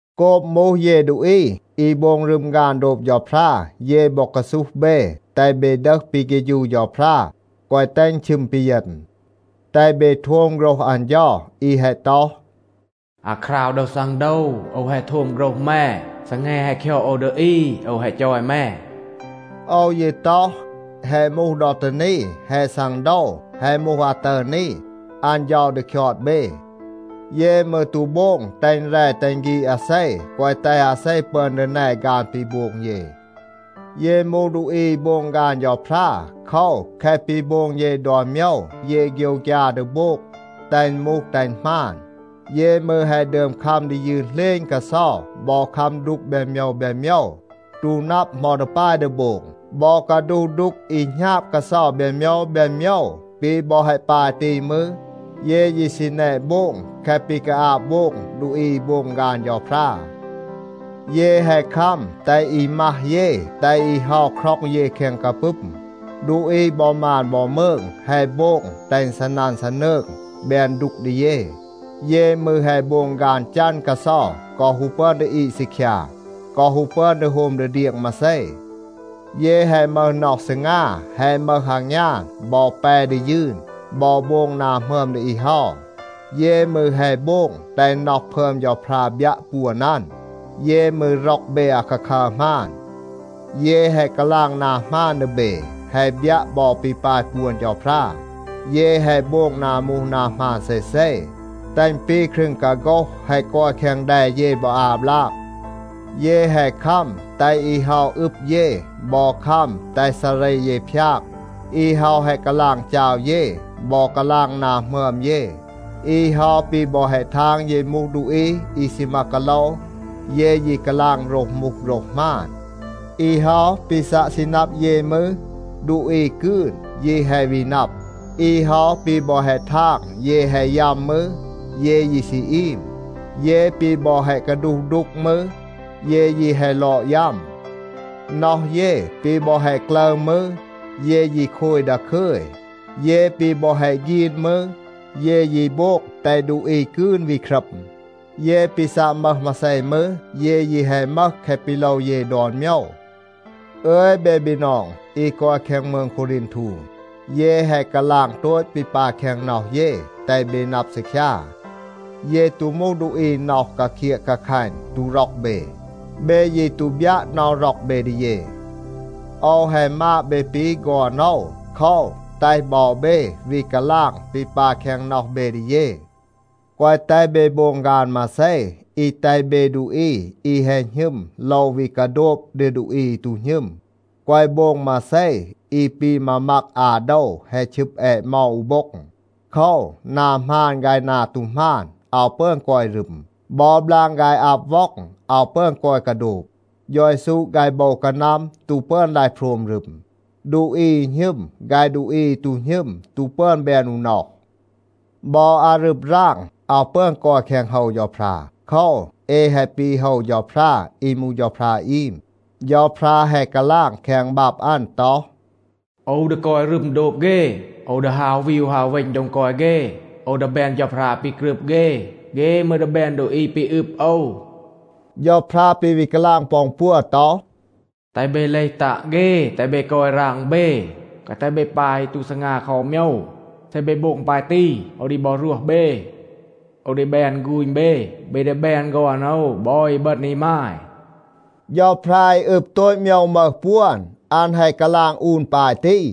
โกบ มูห เย ดูอี อี โบง รึม ฆาน โดบ เฌาพรา, เย บอ กาซูห เบ, แตห เบ ดึห ปี เฆฌู เฌาพรา, แกวะ แตห อึณ ชึม ปีเยณ. แตห เบ โทม โฆรห อัน เฌา อี แฮะ ต็อห, “อาคราว ดอ ซังโดว, โอว แฮะ โทม โฆรห แม. ซีแง แฮะ คยอด โอว ดี อี, โอว แฮะ จอย แม.” โอว ยี ต็อห, แฮะ มูห ดอ ตี นี, แฮะ ซังโดว. แฮะ มูห อาตึร นี, อัน เฌา ดี คยอด เบ. เย มืร ตู โบง แตห อึณ แร, แตห อึณ ฆีด อาเซ, แกวะ แตห อาเซ ปึอน ดี แน ฆาน ปี โบง เย. เย มูห ดูอี อี โบง ฆาน เฌาพรา. โคว, แคะ ปี โบง เย ดอน โมยว, เย โฆยวฆยา ดี โบง, แตห อึณ มูห แตห อึณ หมาน. เย มืร แฮะ ดึอม คัม ดี ยืน เหลณ กาเซา, บอ คัม ดูก แบน โมยว แบน โมยว, ตู นับ เหมา ดี ปาย ดี โบง, บอ กาดูห ดูก อี หณาบ กาเซา แบน โมยว แบน โมยว. ปี บอ แฮะ ปาย ตี มืร, เย ยี ซี แนะ โบง แคะ ปี กาอาบ โบง ดูอี อี โบง ฆาน เฌาพรา. เย แฮะ คัม แตห อี มัห เย, แตห อี เฮา คร็อง เย แคง กาปึม. ดูอี บอ มาน บอ มืง แฮะ โบง แตห อึณ ซีนัน ซีนืง, แบน ดูก ดี เย. เย มืร แฮะ โบง ฆาน จัน กาเซา กอ ฮู ปึอน ดี อีด ซีคยา, กอ ฮู ปึอน ดี โฮม ดี เดียง มาเซ. เย แฮะ มึห น็อห ซีงา, แฮะ มึห อางยาน, บอ แป ดี ยืน, บอ โบง นา หมึอม ดี อี เฮา. เย มืร แฮะ โบง แตห น็อห พึอม เฌาพรา บยัะ ปวน อัน. เย มืร ร็อก เบ อาคาคัร หมาน. เย แฮะ กาลาง นา หมาน ดี เบ, แฮะ บยัะ บอ ปี ปาย ปวน เฌาพรา. เย แฮะ โบง นา มูห นา หมาน เซเซ, แตห อึณ ปี ครึง กาโฆห แฮะ กอย แคง แด เย บอ อา บลาก. เย แฮะ คัม แตห อี เฮา อืบ เย บอ คัม แตห ซาเร เย พยาก. อี เฮา แฮะ กาลาง จาว เย, บอ กาลาง นา หมึอม เย. อี เฮา ปี บอ แฮะ ทาง เย มูห ดูอี อี ซีมา กาโลว, เย ยี กาลาง โฆรห มูห โฆรห หมาน. อี เฮา ปี ซัะ ซี นับ เย มืร, ดูอี กืน ยี แฮะ วี นับ. อี เฮา ปี บอ แฮะ ทาง เย แฮะ ยัม มืร, เย ยี ซี อีม. เย ปี บอ แฮะ กาดูห ดูก มืร, เย ยี แฮะ ลอด ยัม. น็อห เย ปี บอ แฮะ กลึร มืร, เย ยี โคย ดาคึย. เย ปี บอ แฮะ ฆีน มืร, เย ยี โบง แตห ดูอี กืน วี ครัม. เย ปี ซัะ มึห มาเซ มืร, เย ยี แฮะ มึห แคะ ปี โลว เย ดอน โมยว. อึย เบ บีนอง อี กอย แคง มืง โควรีนทู, เย แฮะ กาลาง โตต ปี ปาย แคง น็อห เย, แตห เบ นับ ซีคยา. เย ตู มูห ดูอี น็อห กาเคียะ กาคัณ ตู ร็อก เบ. เบ ยี ตู บยัะ น็อห ร็อก เบ ดี เย. โอว แฮะ มาด เบ ปี ฆอน โอว. โคว, แตห บอ เบ วี กาลาง ปี ปาย แคง น็อห เบ ดี เย. แกวะ แตห เบ โบง ฆาน มาเซ อี แตห เบ ดูอี อี แฮะ หณึม โลว วี กาโดบ ดี ดูอี อี ตู หณึม. แกวะ โบง มาเซ อี ปี มามัก อา โดว แฮะ ชึบ แอะเมา อู โบ็ง. โคว, นา หมาน ฆาย นา ตู หมาน อาว ปึอน กอย รึม. บอ บลาง ฆาย อับ ว็อง อาว ปึอน กอย กาโดบ. เฌา เยซู ฆาย โบว กานัม ตู ปึอน ลาย โพรม รึม. ดูอี อี หณึม ฆาย ดูอี อี ตู หณึม ตู ปึอน แบน อู น็อห. บอ อารึบ ราง อาว ปึอน กอย แคง โฮว เฌาพรา. โคว, เอ แฮะ ปี โฮว เฌาพรา อี มูห เฌาพรา อีม. เฌาพรา แฮะ กาลาง แคง บับ อัน ต็อห, “โอว ดี กอย รึม โดบ เฆ. โอว ดี ฮาว วีว ฮาว เวณ โดง กอย เฆ. โอว ดี แบน เฌาพรา ปี กรึบ เฆ, เฆ มืร ดี แบน ดูอี ปี อึบ โอว.” เฌาพรา ปี วี กาลาง ปอ อึณ ปัว ต็อห, “แตห เบ เลห ตัะ เฆ. แตห เบ กอย ราง เบ. แกวะ แตห เบ ปา อี ตู ซีงา คอ อู โมยว. เซ เบ โบง ปาย ตี, โอว ดี บอ รวห เบ. โอว ดี แบน ฆูณ เบ. เบ ดี แบน ฆอน โอว บอ อีบึณ อีมาย. เฌาพรา อี อึบ โตต ดอน โมยว, อัน แฮะ กาลาง อูน ปาย ตี.”